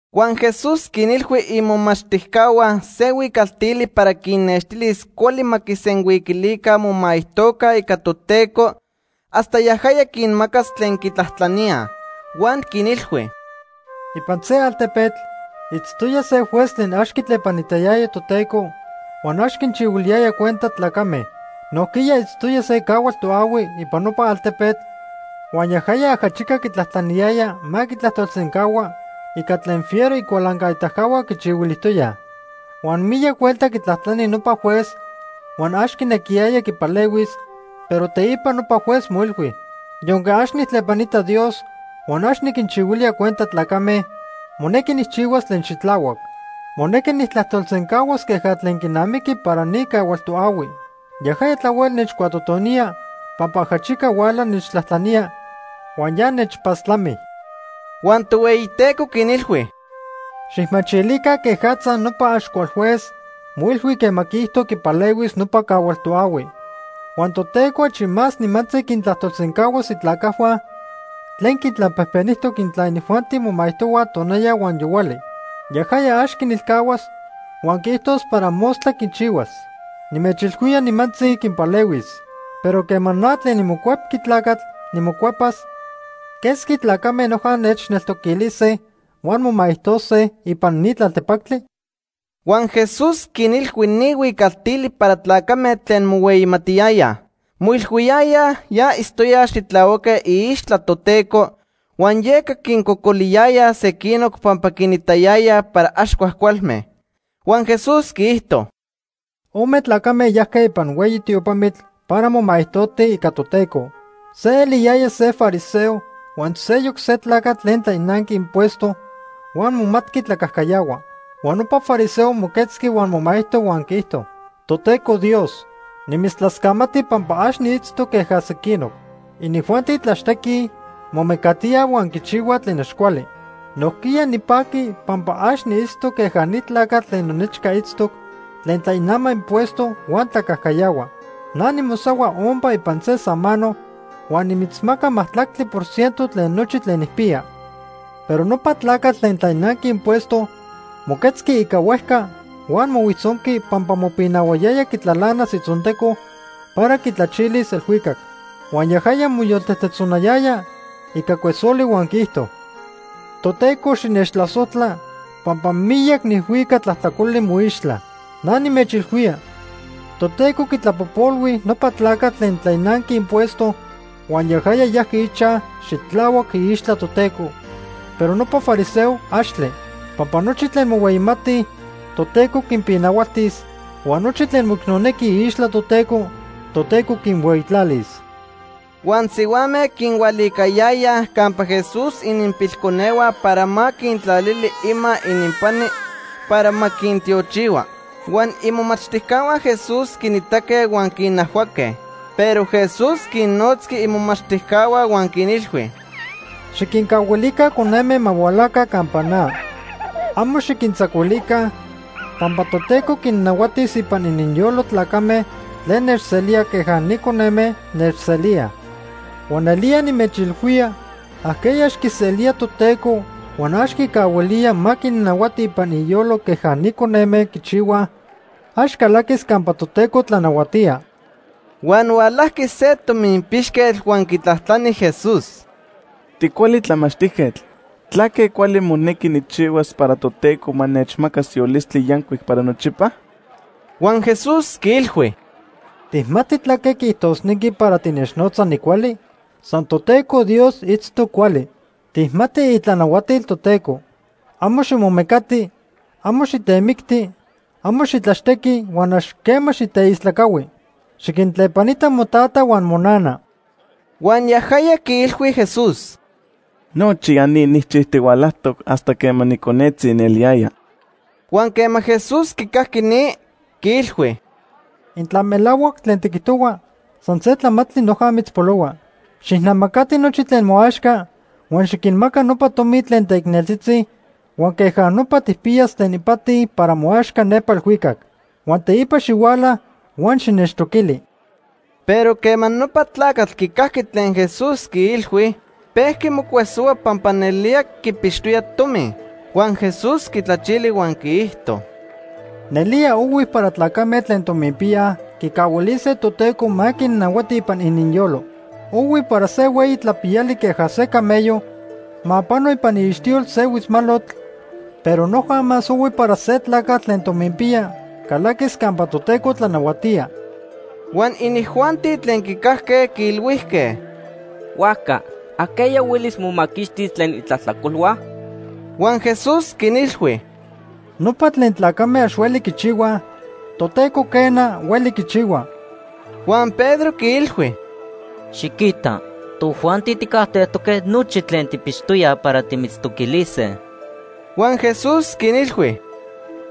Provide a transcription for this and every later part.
Huan Jesús quinilhui imomachtijcahua se huicaltili para quinnextilis cuali ma quisenhuiquilica momaijtoca ica Toteco hasta yajaya quinmacas tlen quitlajtlaníaj. Huan quinilhui: “Ipan se altepetl itztoya se juez tlen ax quitlepanitayaya Toteco huan ax quinchihuiliyaya cuenta tlacame. Nojquiya itztoya se cahual toahui ipan nopa altepetl huan yajaya ajachica quitlajtlaniyaya ma quitlajtolsencahua ica tlen fiero icualancaitacahua quichihuilijtoyaj. Huan miyac huelta quitlajtlani nopa juez huan ax quinequiyaya quipalehuis, pero teipa nopa juez moilhui: ‘Yonque ax nijtlepanita Dios huan ax niquinchihuilía cuenta tlacame, monequi nijchihuas tlen xitlahuac. Monequi nijtlajtolsencahuas queja tlen quinamiqui para ni cahual toahui. Yajaya tlahuel nechcuatotonía pampa ajachica huala nechtlajtlanía huan ya nechpastlami.’” Huan Tohueyiteco quinilhui: “Xijmachilica quejatza nopa ax cual juez moilhui quema quiijto quipalehuis nopa cahual toahui. Huan Toteco achi más nimantzi quintlajtolsencahuas itlacajhua tlen quintlapejpenijtoc intla inijuanti momaijtohuaj tonaya huan yohuali. Yajaya ax quinilcahuas huan quiijtos para mostla quichihuas. Nimechilhuía, nimantzi quinpalehuis. Pero quema na tlen niMocuepqui Tlacatl nimocuepas, ¿quesqui tlacame noja nechneltoquilise huan momaijtojtose ipan ni tlaltepactli?” Huan Jesús quinilhui ni huicaltili para tlacame tlen mohueyimatiyayaj. Moilhuiyayaj ya itztoyaj xitlahuaque iixtla Toteco, huan yeca quincocoliyayaj sequinoc pampa quinitayayaj para ax cuajcualme. Huan Jesús quiijto: “Ome tlacame yajque ipan hueyi tiopamitl para momaijtotij ica Toteco. Se eliyaya se fariseo huan seyoc se tlacatl tlen tlainanqui impuesto huan momatqui tlacajcayahua. Huan nopa fariseo moquetzqui huan momaijto huan quiijto: ‘Toteco Dios, nimitztlascamati pampa ax niitztoc queja sequinoc. Inijuanti tlaxtequij, momecatíaj huan quichihuaj tlen ax cuali. Nojquiya nipaqui pampa ax niitztoc queja ni tlacatl tlen nonechca itztoc tlen tlainama impuesto huan tlacajcayahua. Na nimosahua ompa ipan se samano huan nimitzmaca majtlactli por ciento tlen nochi tlen nijpiya.’ Pero nopa tlacatl tlen tlainanqui impuesto moquetzqui ica huejca huan mohuijtzonqui pampa mopinahuayaya quitlalanas itzonteco para quitlachilis elhuicac. Huan yajaya moyoltejtejtzonayaya ica cuesoli huan quiijto: ‘Toteco xinechtlasojtla pampa miyac nijhuica tlajtlacoli moixtla.’ Na nimechilhuía, Toteco quitlapojpolhui nopa tlacatl tlen tlainanqui impuesto huan yajaya yajqui ichaj xitlahuac iixtla Toteco, pero nopa fariseo, axtle. Pampa nochi tlen mohueyimatij, Toteco quinpinahualtis huan nochi tlen moicnonequij iixtla Toteco, Toteco quinhueyitlalis.” Huan sihuame quinhualicayayaj campa Jesús ininpilconehua para ma quintlalili ima ininpani para ma quintiochihua. Huan imomachtijcahua Jesús quinitaque huan quinajhuaque. Pero Jesús quinnotzqui imomachtijcahua huan quinilhui: ―Xiquincahuilica coneme ma hualaca campa na. Amo xiquintzacuilica, pampa Toteco quinnahuatis ipan ininyolo tlacame tlen nechselíaj queja ni coneme nechselíaj. Huan nelía nimechilhuía ajqueya ax quiselía Toteco huan ax quicahuilía ma quinnahuati ipan iyolo queja ni coneme quichihuaj, ax calaquis campa Toteco tlanahuatía. Huan hualajqui se tominpixquetl huan quitlajtlani Jesús: ―Ticuali tlamachtijquetl, ¿tlaque cuali monequi nijchihuas para Toteco ma nechmacas yolistli yancuic para nochipa? Huan Jesús quiilhui: ―¿Tijmati tlaque quiijtosnequi para tinechnotza nicuali? San Toteco Dios itztoc cuali. Tijmati itlanahuatil Toteco: ‘Amo ximomecati, amo xitemicti, amo xitlaxtequi huan ax quema xiteistlacahui. Xiquintlepanita motata huan monana.’ Huan yajaya quiilhui Jesús: ―Nochi ya ni nijchijtihualajtoc hasta quema niconetzi nieliyaya. Huan quema Jesús quicajqui ni, quiilhui: ―Intla melahuac tlen tiquijtohua, san se tlamantli noja mitzpolohua. Xijnamacati nochi tlen moaxca huan xiquinmaca nopa tomi tlen teicneltzitzi huan queja nopa tijpiyas tlen ipati para moaxca nepa elhuicac. Huan teipa xihuala huan xinechtoquili. Pero quema nopa tlacatl quicajqui tlen Jesús quiilhui, pejqui mocuesohua pampa nelía quipixtoya tomi. Huan Jesús quitlachili huan quiijto: ―Nelía ohui para tlacame tlen tominpiyaj quicahuilise Toteco ma quinnahuati ipan ininyolo. Ohui para se hueyi tlapiyali queja se camello ma pano ipan iixtiyol se huitzmalotl, pero noja más ohui para se tlacatl tlen tominpiya calaquis campa Toteco tlanahuatía. Huan inijuanti tlen quicajque quiilhuijque: ―Huajca ¿ajqueya huelis momaquixtis tlen itlajtlacolhua? Huan Jesús quinilhui: ―Nopa tlen tlacame ax hueli quichihuaj, Toteco quena, hueli quichihua. Huan Pedro quiilhui: ―Xiquita, tojuanti tijcajtejtoque nochi tlen tijpixtoyaj para timitztoquilise. Huan Jesús quinilhui: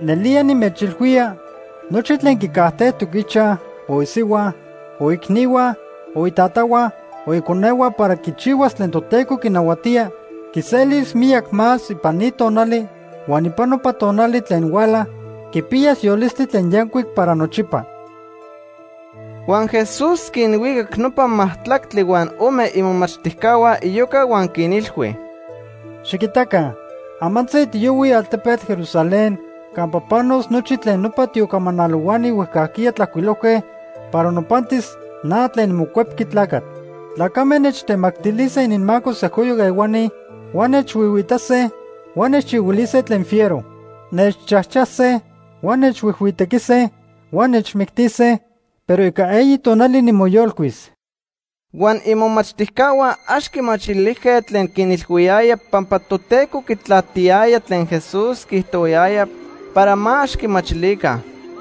―Nelía nimechilhuía nochi tlen quicajtejtoc ichaj, o isihua, o iicnihua, o itatahua o iconehua para quichihuas tlen Toteco quinahuatía, quiselis miyac más ipan ni tonali huan ipan nopa tonali tlen huala, quipiyas yolistli tlen yancuic para nochipa. Huan Jesús quinhuicac nopa majtlactli huan ome imomachtijcahua iyoca huan quinilhui: “Xiquitaca, amantzi tiyohuij altepetl Jerusalén campa panos nochi tlen nopa tiocamanalohuani huejcajquiya tlajcuilojque para nopantis na tlen niMocuepqui Tlacatl. Tlacame nechtemactilise ininmaco sejcoyoc ehuani huan nechhuihuiitase huan nechchihuilise tlen fiero. Nechchajchase, huan nechhuijhuitequise huan nechmictise, pero ica eyi tonali nimoyolcuis.” Huan imomachtijcahua ax quimachilijque tlen quinilhuiyaya pampa Toteco quitlatiyaya tlen Jesús quiijtohuayaya para ma ax quimachilica.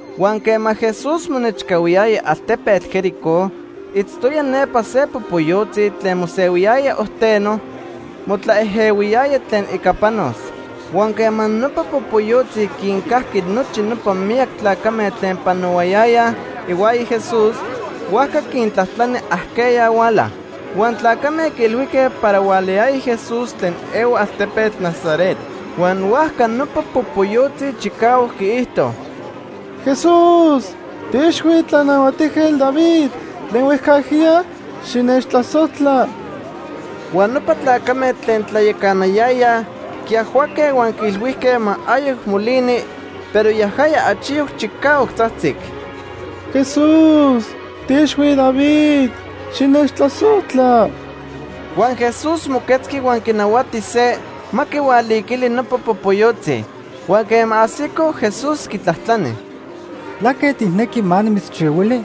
Huan quema Jesús monechcahuiyaya altepetl Jericó, itztoya nepa se popoyotzi tlen mosehuiyaya ojteno motlaejehuiyaya tlen ica panos. Huan quema nopa popoyotzi quincajqui nochi nopa miyac tlacame tlen panohuayayaj ihuaya Jesús, huajca quintlajtlani ajqueya huala. Huan tlacame quiilhuijque para hualayaya Jesús tlen ehua altepetl Nazaret. Huan huajca nopa popoyotzi chicahuac quiijto: ―¡Jesús, tiiixhui Tlanahuatijquetl David tlen huejcajquiya, xinechtlasojtla! Huan nopa tlacame tlen tlayacanayayaj quiajhuaque huan quiilhuijque ma ayoc molini, pero yajaya achiyoc chicahuac tzajtzic: ―¡Jesús tiiixhui David, xinechtlasojtla! Huan Jesús moquetzqui huan quinahuati se ma quihualiquili nopa popoyotzi. Huan quema ajsico, Jesús quitlajtlani: ―¿Tlaque tijnequi ma nimitzchihuili?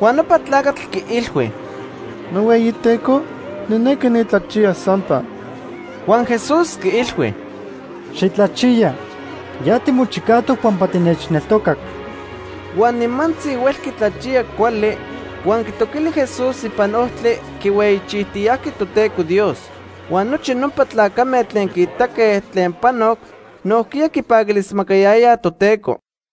Huan nopa tlacatl quiilhui: ―NohueyiTeco, nijnequi nitlachiyas sampa. Huan Jesús quiilhui: ―¡Xitlachiya! Ya timochicajtoc pampa tinechneltocac. Huan nimantzi huelqui tlachiya cuali, huan quitoquili Jesús ipan ojtli, quihueyichijtiyajqui Toteco Dios. Huan nochi nopa tlacame tlen quiitaque tlen panoc nojquiya quipaquilismacayayaj Toteco.